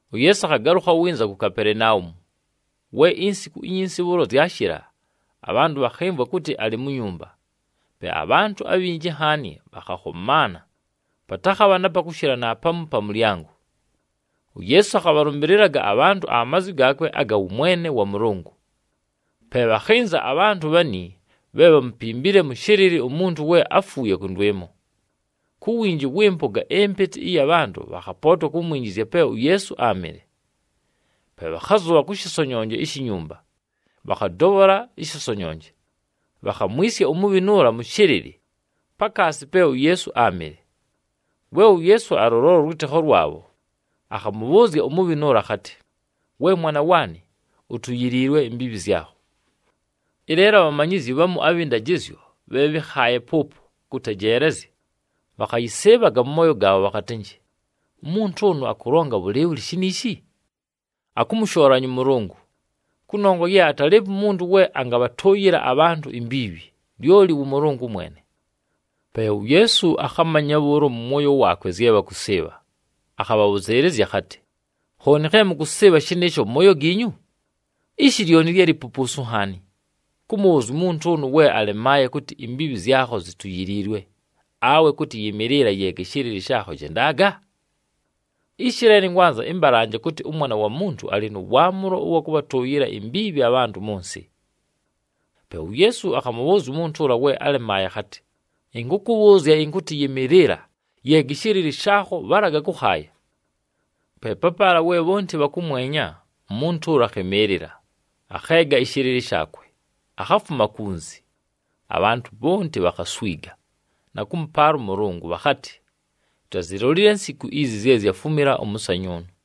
UYeesu akhagalʉkha winza ku Kapelenaumu. We insiku inyinsi bhʉʉlo zyashɨla, abhantʉ bhakhɨmvwa kʉtɨ alɨ mu nyumba. Pe abhantʉ abhinji nhaani bhakhakhomaana, patakhabha na pa kʉshɨla naapamu pa mʉlyango. UYeesu akhabhalʉmbɨlɨlaga abhantʉ amazwi gaakwe aga wʉmwene wa Mʉlʉngʉ. Pe bhakhɨnza abhantʉ bhani bhe bhámupimbile mʉ shɨlɨlɨ umuntu we áfuuye kʉndwɨmo. Ku winji wɨ mpʉga ɨmpɨtɨ ɨya bhantʉ, bhakhapootwa kumwinjizya pe uYeesu áamɨle. Pe bhakhazʉbha kʉ shɨsonyonje ishi nyumba, bhakhadobhola ɨshɨsonyonje. Bhakhamwisya umubhinu ʉla mʉ shɨlɨlɨ, pakaasi pe uYeesu áamɨle. We uYeesu alʉlola ʉlwɨtɨkho lwabho, akhamʉbhʉʉzya umubhinu ʉla akhatɨ, “We mwana waanɨ, utuyiliilwe imbiibhi zyakho.” Ɨleelo abhamanyizyi bhamu abhɨ ndajɨzyo bhe bhɨ́khaaye pʉʉpo kʉtejeelezya, bhakhayɨsɨɨbhaga mʉ mooyo gaabho bhakhatɨnjɨ, “Umuntu ʉnʉ akʉlonga bhʉlɨɨbhʉlɨ shiniishi? Akʉmʉshoolanya ʉMʉlʉngʉ, kʉnongwa ye atalɨɨpo umuntu we angabhatʉʉyɨla abhantʉ imbiibhi, lyoli wʉ Mʉlʉngʉ mwene.” Pe uYeesu akhamanya bhʉʉlo mʉ mwoyo waakwe zye bhakʉsɨɨbha, akhabhabhʉzɨɨlɨzya akhatɨ, “Khooni khe mʉkʉsɨɨbha shɨnɨɨsho mʉ mooyo giinyu? Ishi lyoni lye lipupuusu nhaani, kʉmʉbhʉʉzya umuntu ʉnʉ we alemaaye kʉtɨ, ‘Imbiibhi zyakho zituyiliilwe,’ awe kʉtɨ, ‘Yɨmɨɨlɨla, yeega ɨshɨlɨlɨ shaakho, jendaga’? Ishi leelo ɨnkwanza ɨmbalanje kʉtɨ, ʉMwana wa Muntu alɨ nʉ waamʉlo ʉwa kʉbhatʉʉyɨla imbiibhi abhantʉ mʉ nsɨ.” Pe uYeesu akhamʉbhʉʉzya umuntu ʉla we alemaaye akhatɨ, “Ɨnkʉkʉbhʉʉzya ɨnkʉtɨ yɨmɨɨlɨla, yeega ɨshɨlɨlɨ shaakho, bhalaga kʉkhaaya.” Pe papaala we bhonti bhakʉmwenya, umuntu ʉla akhɨmɨɨlɨla, akheega ɨshɨlɨlɨ shaakwe, akhafuma kunzi. Abhantʉ bhonti bhakhaswiga, na kʉmʉpaala ʉMʉlʉngʉ bhakhatɨ, “Tutazilolile nsiku izi zye zyafumila ʉmʉsanyʉʉnʉ.”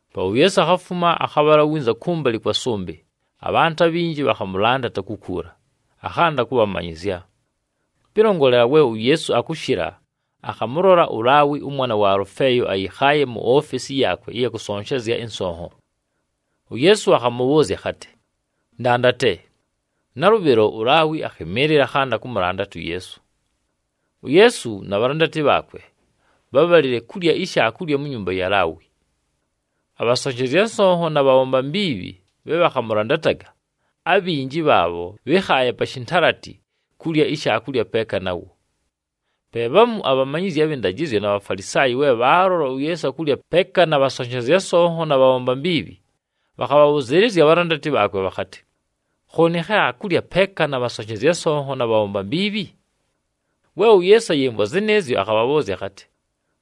Pe uYeesu akhafuma, akhabhala winza kʉmbalɨ kwa sʉmbɨ, abhantʉ abhinji bhakhamʉlandata kukuula, akhanda kʉbhamanyɨzya. Pɨlongolela we uYeesu akʉshɨla, akhamʉlola uLaawi ʉmwana wa Alʉfeeyo ayɨkhaaye mu ofesi yaakwe ɨya kʉsonshezya ɨnsonho. UYeesu akhamʉbhʉʉzya akhatɨ, “Ndandate.” Nalʉbhɨlo, uLaawi akhɨmɨɨlɨla, akhanda kʉmʉlandata uYeesu. UYeesu na bhalandati bhaakwe, bhábhalile kulya ishaakulya mu nyumba ya Laawi. Abhasonshezya nsonho na bhabhomba mbiibhi bhe bhakhamʉlandataga, abhinji bhaabho bhɨ́khaaye pa shintalati kulya ishaakulya peeka nawo. Pe bhamu abhamanyizyi abhɨ ndajɨzyo na Bhafalisaayi we bhaalola uYeesu akulya peeka na bhasonshezya nsonho na bhabhomba mbiibhi, bhakhabhabhʉzɨɨlɨzya abhalandati bhaakwe bhakhatɨ, “Khooni khe akulya peeka na bhasonshezya nsonho na bhabhomba mbiibhi?” We uYeesu ayɨmvwa zɨnɨɨzyo, akhabhabhʉʉzya akhatɨ,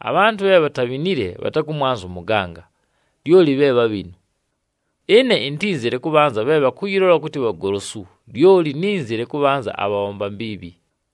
“Abhantʉ bhe bhatabhinile bhatakʉmwanza ʉmʉganga, lyoli bhe bhabhinu. Ɨne intínzile kʉbhanza bhe bhakʉyɨlola kʉtɨ bhagolosu, lyoli nínzile kʉbhanza abhabhomba mbiibhi.”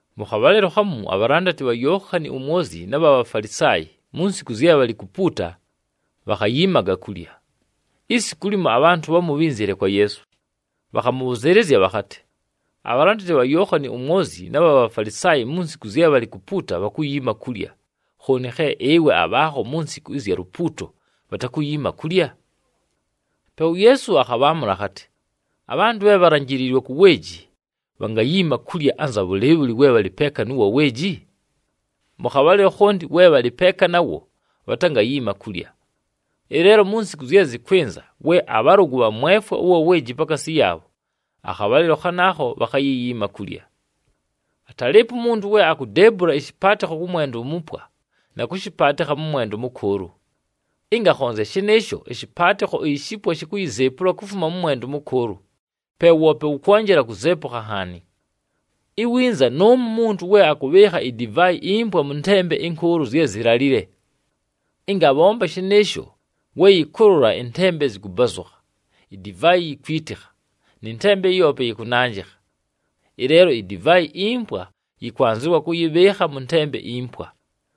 Mʉ khabhalɨlo khamu, abhalandati bha Yookhani uMwozyi na bha Bhafalisaayi, mu nsiku zye bhalɨ kupuuta, bhakhayiimaga kulya. Isiku limo, abhantʉ bhamu bhínzile kwa Yeesu, bhakhamʉbhʉzɨɨlɨzya bhakhatɨ, “Abhalandati bha Yookhani uMwozyi na bha Bhafalisaayi mu nsiku zye bhalɨ kupuuta bhakuyiima kulya, khooni khe ɨwe abhaakho mu nsiku ɨzya lupuuto bhatakuyiima kulya?” Pe uYeesu akhabhaamʉla akhatɨ, “Abhantʉ bhe bhalanjiliilwe ku weeji, bhangayiima kulya anza bhʉlɨɨbhʉlɨ, we bhalɨ peeka nʉ wa weeji? Mʉ khabhalɨlo khonti we bhalɨ peeka nawo bhatangayiima kulya. Ɨleelo mu nsiku zye zɨkwɨnza, we abhalʉgʉ bhamwefwa ʉwa weeji pakaasi yaabho, akhabhalɨlo khanaakho bhakhayiyiima kulya. “Atalɨɨpo umuntu we akudeebula ɨshɨpaatɨkho kʉ mwenda umupwa, na kʉshɨpaatɨkha mʉ mwenda ʉmʉkʉʉlʉ. Ɨnga akhonzya shɨnɨɨsho, ɨshɨpaatɨkho ishipwa shikuyizeepula kufuma kʉ mwenda ʉmʉkʉʉlʉ, pe woope wʉkwonjela kuzeepukha nhaani. Iwinza nʉʉmo umuntu we akʉbhɨɨkha idivaayi impwa mʉ ntembe ɨnkʉʉlʉ zye zilalile. Ɨnga abhomba shɨnɨɨsho, we yɨkʉlʉla ɨntembe zɨkʉbazʉkha, idivaayi yikwitikha nɨ ntembe yoope yɨkʉnanjɨkha. Ɨleelo idivaayi impwa yɨkwanzɨwa kʉyɨbhɨɨkha mʉ ntembe impwa.”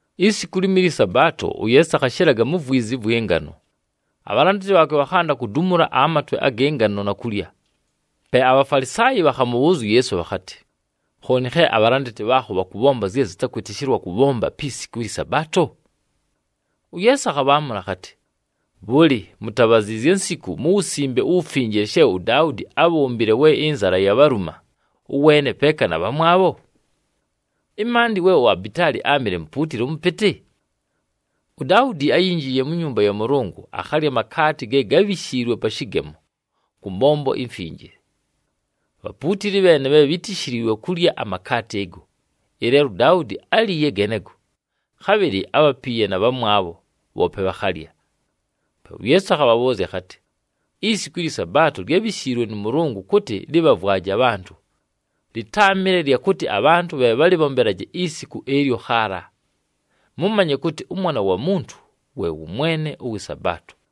Isiku limo ɨlyɨ Sabaato, uYeesu akhashɨlaga mu vwizi ɨvwɨ ngano. Abhalandati bhaakwe bhakhanda kudumula amatwe agɨ ngano na kulya. Pe aBhafalisaayi bhakhamʉbhʉʉzya uYeesu bhakhatɨ, “Khooni khe abhalandati bhaakho bhakʉbhomba zye zɨtakwɨtɨshɨlwa kʉbhomba pi siku ɨlyɨ Sabaato?” UYeesu akhabhaamʉla akhatɨ, “Bhʉlɨ, mutabhaziizye nsiku mu Wusimbe uWufinjile she uDaudi ábhombile we ɨnzala yabhaluma, ʉweene peeka na bhamwabho? Ɨmaandɨ we uAbitaali áamɨle mupuutili mʉpɨtɨ? UDaudi áyinjiiye mu nyumba ya Mʉlʉngʉ, akhalya amakaati ge gábhishiilwe pa shɨgemo kʉ mbombo imfinjile. Bhapuutili bheene bhe bhítishiliilwe kulya amakaati ɨgo, ɨleelo uDaudi áliiye genego, khabhɨlɨ ábhapiiye na bhamwabho, bhoope bhakhalya.” Pe uYeesu akhabhabhʉʉzya akhatɨ, “Isiku ɨlyɨ Sabaato lyábhishiilwe nʉ Mʉlʉngʉ kʉtɨ lɨbhavwaje abhantʉ, lɨtáamɨle lya kʉtɨ abhantʉ bhe bhalɨbhombelaje isiku ɨlyo khaala. Mʉmanye kʉtɨ ʉMwana wa Muntu we wʉ Mwene ʉwɨ Sabaato.”